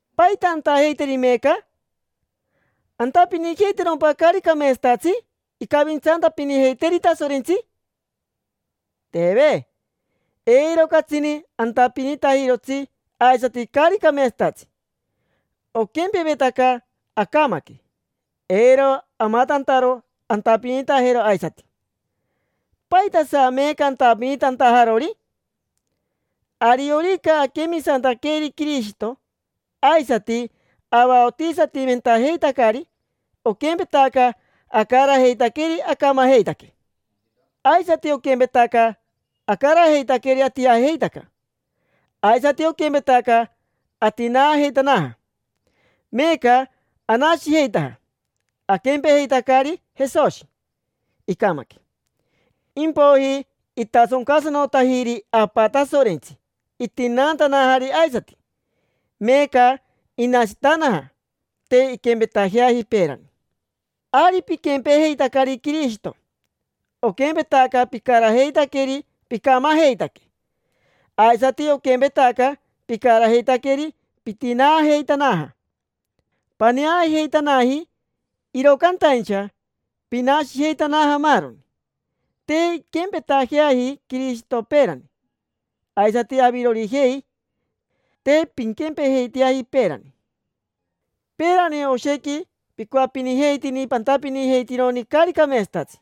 ¿Paita antajeiteri meeca? ¿Antapinijeitajerompa caari cameetsatatsi incavintsantapinijeiteeri Tasorentsi? Teve. Eiro catsini antapinitajirotsi aisati caari cameetsatatsi. Oquempevetaca acamaque, eiro amatantaro antapinitajero aisati. ¿Paitasa, meeca, antapinitantajarori? Ariorica aquemisantaqueri Quirishito aisati avaotisatimentajeitacari, oquempetaca acarajeitaqueri acamajeitaque. Aisati oquempetaca acarajeitaqueri atijajeitaca, aisati oquempetaca atinaajeitanaja. Meeca anashijeitaja, aquempejeitacari Jesoshi: icamaque, impoiji itasoncasanotajiri Apa Tasorentsi itinaantanajari aisati. Meeca inashitanaja, te inquempetajeaji peerani. Ari piquempejeitacari Quirishito. Oquempetaca picarajeitaqueri picamajeitaque, aisati oquempetaca picarajeitaqueri pitinaajeitanaja: paneajeitanaji, iro cantaincha pinashijeitanaja maaroni. Te inquempeteaji Quirishito peerani; aisati avirorijei, te pinquempejeiteaji peerani. Peerani oshequi picoapinijeitini pantapinijeitironi caari cameetsatatsi,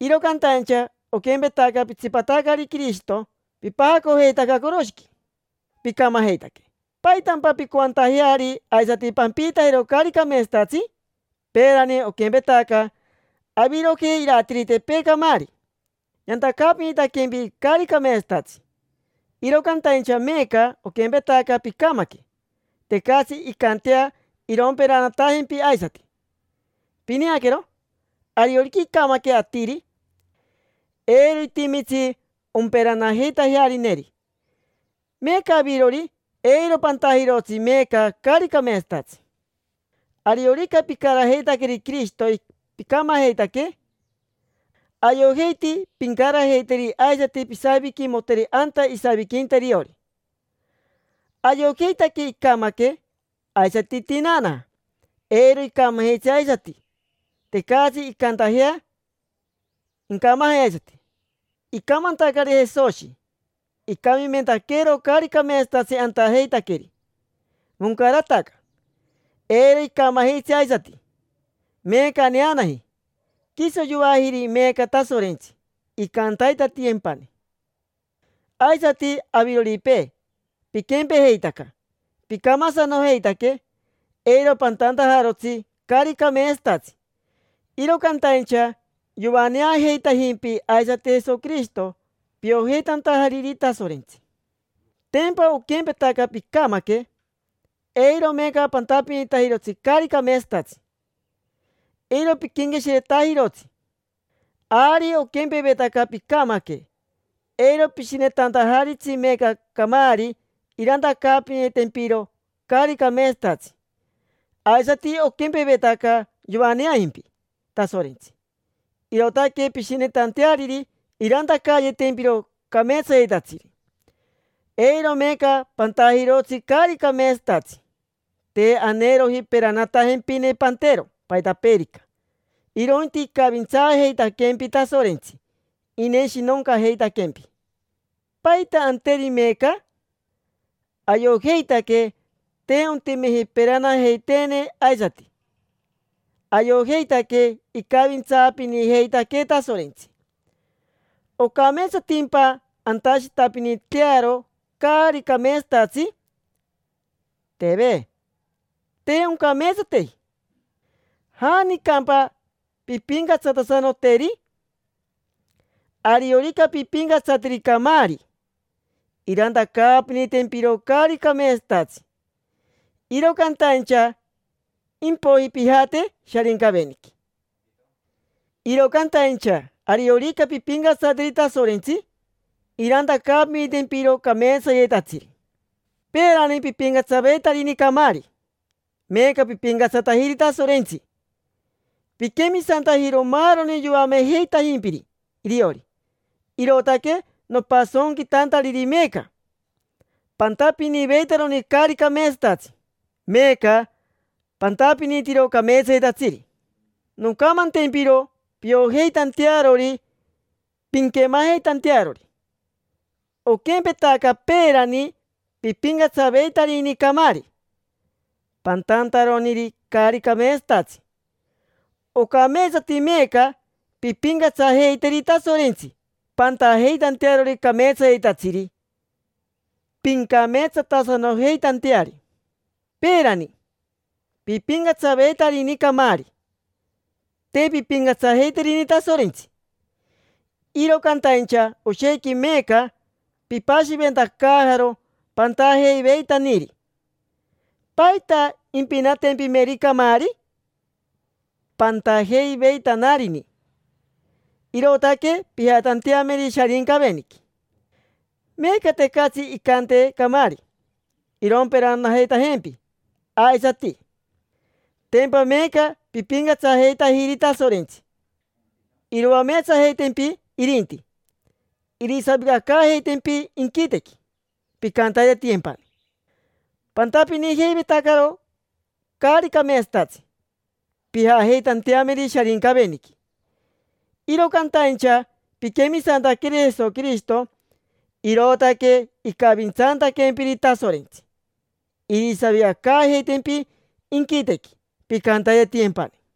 iro cantaincha oquempetaca pitsipatacari Quirishito pipajacojeitaca coroshiqui, picamajeitaque: ¿paitampa pincoantajeari aisati pampiitajero caari cameetsatatsi? Peerani oquempetaca avirojei iratiritepee camaari, yantacaapinitaquempi caari cameetsatatsi; iro cantaincha meeca oquempetaca picamaque, tecatsi incantea iromperanatajempi aisati. Pineaquero, ariorica incamaque atiri, eiro itimitsi omperanajeitajearineri. Meeca avirori, eiro pantajirotsi meeca caari cameetsatatsi. Ariorica picarajeitaqueri Quirishito picamajeitaque, ayojeiti pincarajeiteri aisati pisaviquimoteri anta isaviquinta iriori. Ayojeitaque icamaque, aisati itinaanaja. Eiro icamajitsi aisati: tecatsi incantajea incamaje aisati. Icamantacari Jesoshi, icamimentaqueero caari cameetsatatsi antajeitaqueri. Moncarataca: eiro icamajitsi aisati. Meeca aneanaji: quiso yoajiri meeca Tasorentsi, incantaitatiyempani. Aisati aviroripee, piquempejeitaca picamasanojeitaque, eiro pantantajarotsi caari cameetsatatsi; iro cantaincha yoaneajeitajimpi aisati Jesoquirishito, piojeitantajariri Tasorentsi. Tempa oquempetaca picamaque: eiro meeca pantapinitajirotsi caari cameetsatatsi, eiro piquenqueshiretajirotsi. Ari oquempevetaca picamaque, eiro pishinetantajaritsi meeca camaari irantacaapinitempiro caari cameetsatatsi. Aisati oquempevetaca yoaneajimpi Tasorentsi, irootaque pishinetanteariri irantacayetempiro cameetsayetatsiri. Eiro meeca pantajirotsi caari cameetsatatsi. Te aneeroji peranatempine pantero paitapeerica, irointi icavintsaajeitaquempi Tasorentsi, ineshinoncajeitaquempi. ¿Paita anteri meeca? Ayojeitaque te ontimeji peranajeiteene aisati ayojeitaque icavintsaapinijeitaquee Tasorentsi. ¿Ocameetsatimpa antashitapinitearo caari cameetsatatsi? Teve, te oncameetsateji. ¿Janicampa pimpincatsatasanoteri? Ariorica pimpincatsateri camaari, irantacaapinitempiro caari cameetsatatsi, iro cantaincha impoiji pijate Sharincaveniqui. Iro cantaincha ariorica pimpincatsateri Tasorentsi, irantacaapinitempiro cameetsayetatsiri. Peerani pipincatsaveitarini camaari, meeca pipincatsatajiri Tasorentsi. Piquemisantajiro maaroni yoamejeitajimpiri iriori, irootaque nopasonquitantariri meeca. Pantapiniveitaroni caari cameetsatatsi, meeca pantapinitiro cameetsayetatsiri. Noncamantempiro piojeitantearori, pinquemajeitantearori. Oquempetaca peerani pipincatsaveitarini camaari pantantaroniri caari cameetsatatsi, ocameetsati meeca pimpincatsajeiteri Tasorentsi pantajeitantearori cameetsayetatsiri, pincameetsatasanojeitanteari. Peerani, pipincatsajeiveitarini camaari, te pimpincatsajeiterini Tasorentsi. Iro cantaincha oshequi meeca pipashiventacaajaro pantajeiveitaniri: ¿paita impinatempimeri camaari? Pantajeiveitanarini, irootaque pijatanteameri Sharincaveniqui. Meeca tecatsi incante camaari iromperanajeitajempi aisati: tempa meeca pipincatsajeitajiri Tasorentsi. Iroameetsajeitempi irinti, irisavicacaajeitempi inquitequi: pincantaitatiyempani. Pantapinijeivetacaro caari cameetsatatsi, pijajeitanteameri Sharincaveniqui. Iro cantaincha piquemisantaqueri Jesoquirishito, irootaque icavintsantaquempiri Tasorentsi, irisavicacaajeitempi inquitequi, pincantaitatiyempani.